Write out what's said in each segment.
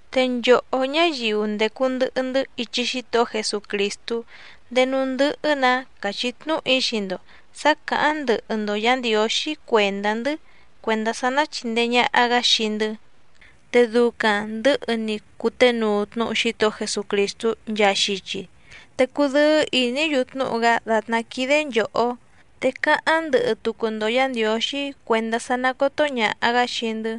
Te nchòhó ñáyiu ndècu ndɨhɨ‑ndɨ́ ichi Xítohó Jesucrìstú, ndéé núú ndɨ́hɨ́‑nǎ càchí tnúhu‑í xii‑ndo sǎ cǎháⁿ ndɨhɨ‑ndo Yǎ Ndiǒxí cuèndá‑ndɨ́ cuèndá sá ná chìndee ñaha‑gá xii‑ndɨ́, te ducaⁿ ndɨ̌hɨ‑ni cuténuu tnúhu Xítohó Jesucrìstú nchaa xichi, te cudɨ́ɨ́ ìní‑yu tnúhu‑gá dàtná quídé nchòhó. Te cáháⁿ ndɨhɨ tucu‑ndo Yǎ Ndiǒxí cuèndá sá ná còto ñaha‑gá xii‑ndɨ́,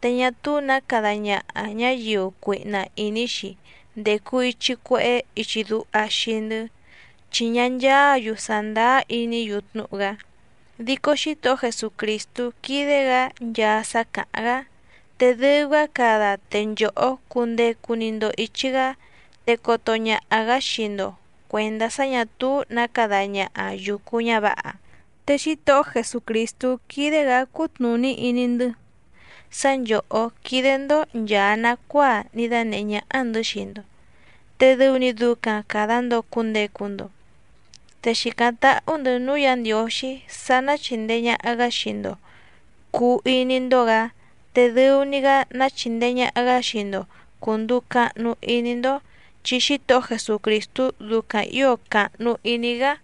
te ñá túú nǎ cada ñaha ñǎyiu cuihna ìní‑xi ndècu ichi cuehé ichi duha xii‑ndɨ́, chi ñá ncháǎ‑yu sàndáá iní‑yu tnúhu‑gá. Dico Xítohó Jesucrìstú quídé‑gǎ nchaa sá càháⁿ‑gá, te dɨu‑gá cada te nchòhó cundecu‑ni‑ndo ìchi‑gá, te coto ñaha‑gǎ xii‑ndo cuèndá sá ñà túú nǎ cada ñaha yùcu ñávǎha. Te Xítohó Jesucrìstú quídé‑gǎ cútnùní iní‑ndɨ́ sá nchòhó quídé‑ndó nchàa nacuáa ní dánèhé ñáhá‑ndɨ̌ xii‑ndo, te dɨu‑ni ducaⁿ càda‑ndo cundecu‑ndo. Te xìcáⁿ táhú‑ndɨ̌ núú Yǎ Ndiǒxí sá ná chìndee ñaha‑gá xii‑ndo cùu iní‑ndó‑gǎ, te dɨu‑ni‑gá ná chìndee ñaha‑gá xii‑ndo cùnduu cahnu iní‑ndó, chi Xítohó Jesucrìstú ducaⁿ ǐo càhnu iní‑gá.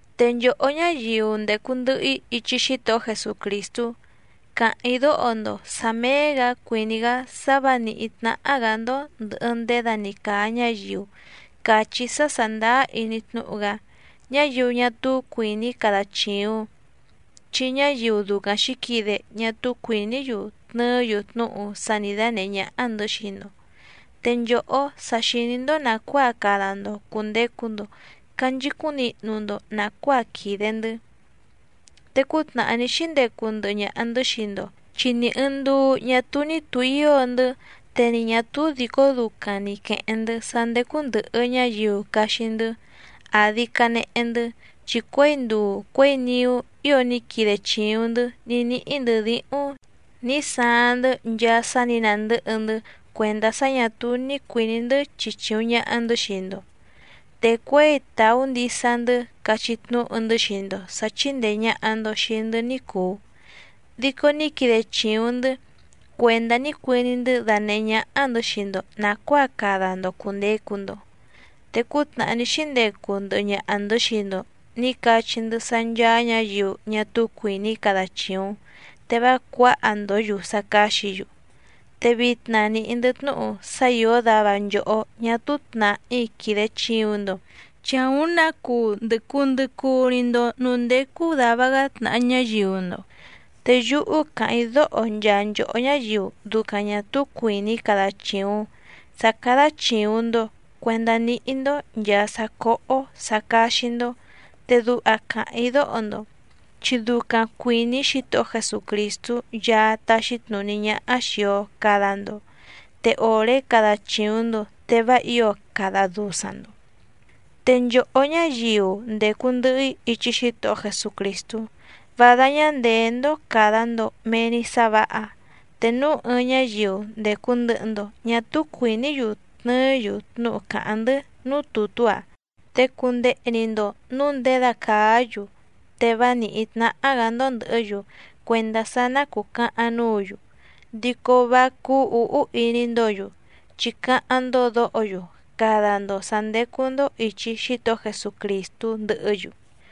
Te nchòhó ñáyiu ndècu ndɨhɨ‑í ichi Xítohó Jesucrìstú, càháⁿ‑í dóho‑ndo sǎ méé‑gǎ cuìní‑gá sá vǎ nìhí tnáhá‑gǎ‑ndó ndɨ̀hɨ ndéda‑ni càa ñáyiu càchí sá sàndáá iní tnúhu‑gá, ñáyiu ñá túú cuìní cada chìuⁿ, chi ñáyiu ducaⁿ xǐquide ñá túú cuìní‑yu tnɨɨ́‑yu tnúhu sá nǐ dánèhé ñáhá‑ndɨ̌ xii‑ndo. Te nchòhó sa xìní‑ndó nàcuáa cada‑ndo cùndecu‑ndo canchicúⁿ nihnu‑ndo nàcuáa quìde‑ndɨ́. Te cútnàhá ní xíndecu ndɨhɨ ñaha‑ndɨ̌ xii‑ndo chi ni ɨ̀ɨⁿ nduu ñá túú ní tùhío‑ndɨ́. Te ni ñà túú dìcó ducaⁿ ni quèheⁿ‑ndɨ́ sá ndécú ndɨ̀hɨ ñáyiu caxi‑ndɨ́ àdi canehe‑ndɨ́, chi cuěi nduu cuěi niú ío ní quide chìuⁿ‑ndɨ́ ní níhí‑ndɨ̌ díhúⁿ nǐ saaⁿ‑ndɨ́ nchaa sá nǐ nàndɨ́hɨ‑ndɨ́ cuèndá sá ñà túú ní cuìní‑ndɨ́ chichìuⁿ ñaha‑ndɨ́ xii‑ndo. Te cuěi tàú ndisa‑ndɨ́ cachí tnúhu‑ndɨ́ xii‑ndo sǎ chíndèe ñaha‑ndo xii‑ndɨ́ ní cùu, dico ní quide chìuⁿ‑ndɨ́ cuèndá ní cuiní‑ndɨ́ danèhé ñáhá‑ndɨ̌ xii‑ndo nàcuáa cada‑ndo cùndecu‑ndo. Te cútnàhá ní xíndecu ndɨhɨ ñaha‑ndɨ̌ xii‑ndo nǐ cachí‑ndɨ́ sá ncháá ñǎyiu ñá túú cuìní cada chìuⁿ te vá cuǎha‑ndǒ‑yu sá cáxǐ‑yu. Te vitna nìhí‑ndɨ́ tnúhu sá ìó dava nchòhó ñá túú tnàhí quìde chiuⁿ‑ndo, chi àúⁿ nǎ cuu ndɨ̀ cuu ndɨ cuu‑ni‑ndo núú ndécú dàva‑gá tnàha ñáyiu‑ndo. Te yúhú càháⁿ‑í dóho nchaa nchòhó ñáyiu ducaⁿ ñà túú cuìní cada chìuⁿ sá cádá chìuⁿ‑ndo cuendá níhí‑ndó nchàa sá cóhó sǎ cáxí‑ndó, te duha càháⁿ‑í dóho‑ndo, chi ducaⁿ cuìní Xítohó Jesucrìstú Yaá táxí tnùní ñáhá xìi‑o cada‑ndo, te òré cada chìuⁿ‑ndo te vá ǐo cada dusaⁿ‑ndo. Te nchòhó ñáyiu ndècu ndɨhɨ‑í ichi Xítohó Jesucrìstú, vá dáñá ndèé‑ndó càda‑ndo mee‑ni sá vǎha. Te núu ɨɨⁿ ñáyiu ndècu ndɨhɨ‑ndo ñá túú cuìní‑yu tnɨɨ́‑yu tnúhu càháⁿ‑ndɨ́ núú tùtú‑a, te cundehe‑ni‑ndo nǔu nděda càá‑yu, te vá nìhí tnáhá‑gǎ‑ndó ndɨ̀hɨ́‑yu cuèndá sá ná cùcahaⁿ núǔ‑yu, dico vá cúú ǔhú iní‑ndǒ‑yu, chi cáháⁿ‑ndó dǒho‑yu cada‑ndo sǎ ndécú‑ndó ìchi Xítohó Jesucrìstú ndɨhɨ́‑yu.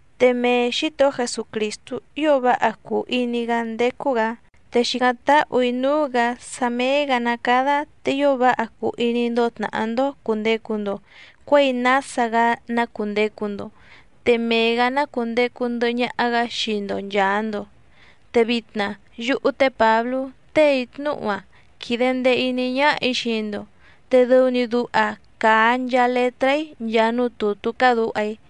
Te mee Xǐtohó Jesucrìstú ío váha cùu iní‑gá ndécú‑gǎ, te xìcáⁿ táhù‑í núú‑gǎ sá méé‑gǎ ná cádá te ío váha cuu iní‑ndó tnàhá‑ndó cùndecu‑ndo cuéi nása‑gá ná cùndecu‑ndo. Te mee‑gǎ ná cùndecu ndɨhɨ ñaha‑gá xii‑ndo nchàa‑ndo. Te vitna yúhú té Pǎblú téè‑í tnúhu‑a quìde ndee iní ñáhà‑í xii‑ndo, te dɨu‑ni duha càa nchaa letrá‑í nchaa núú tùtú cádǔha‑í.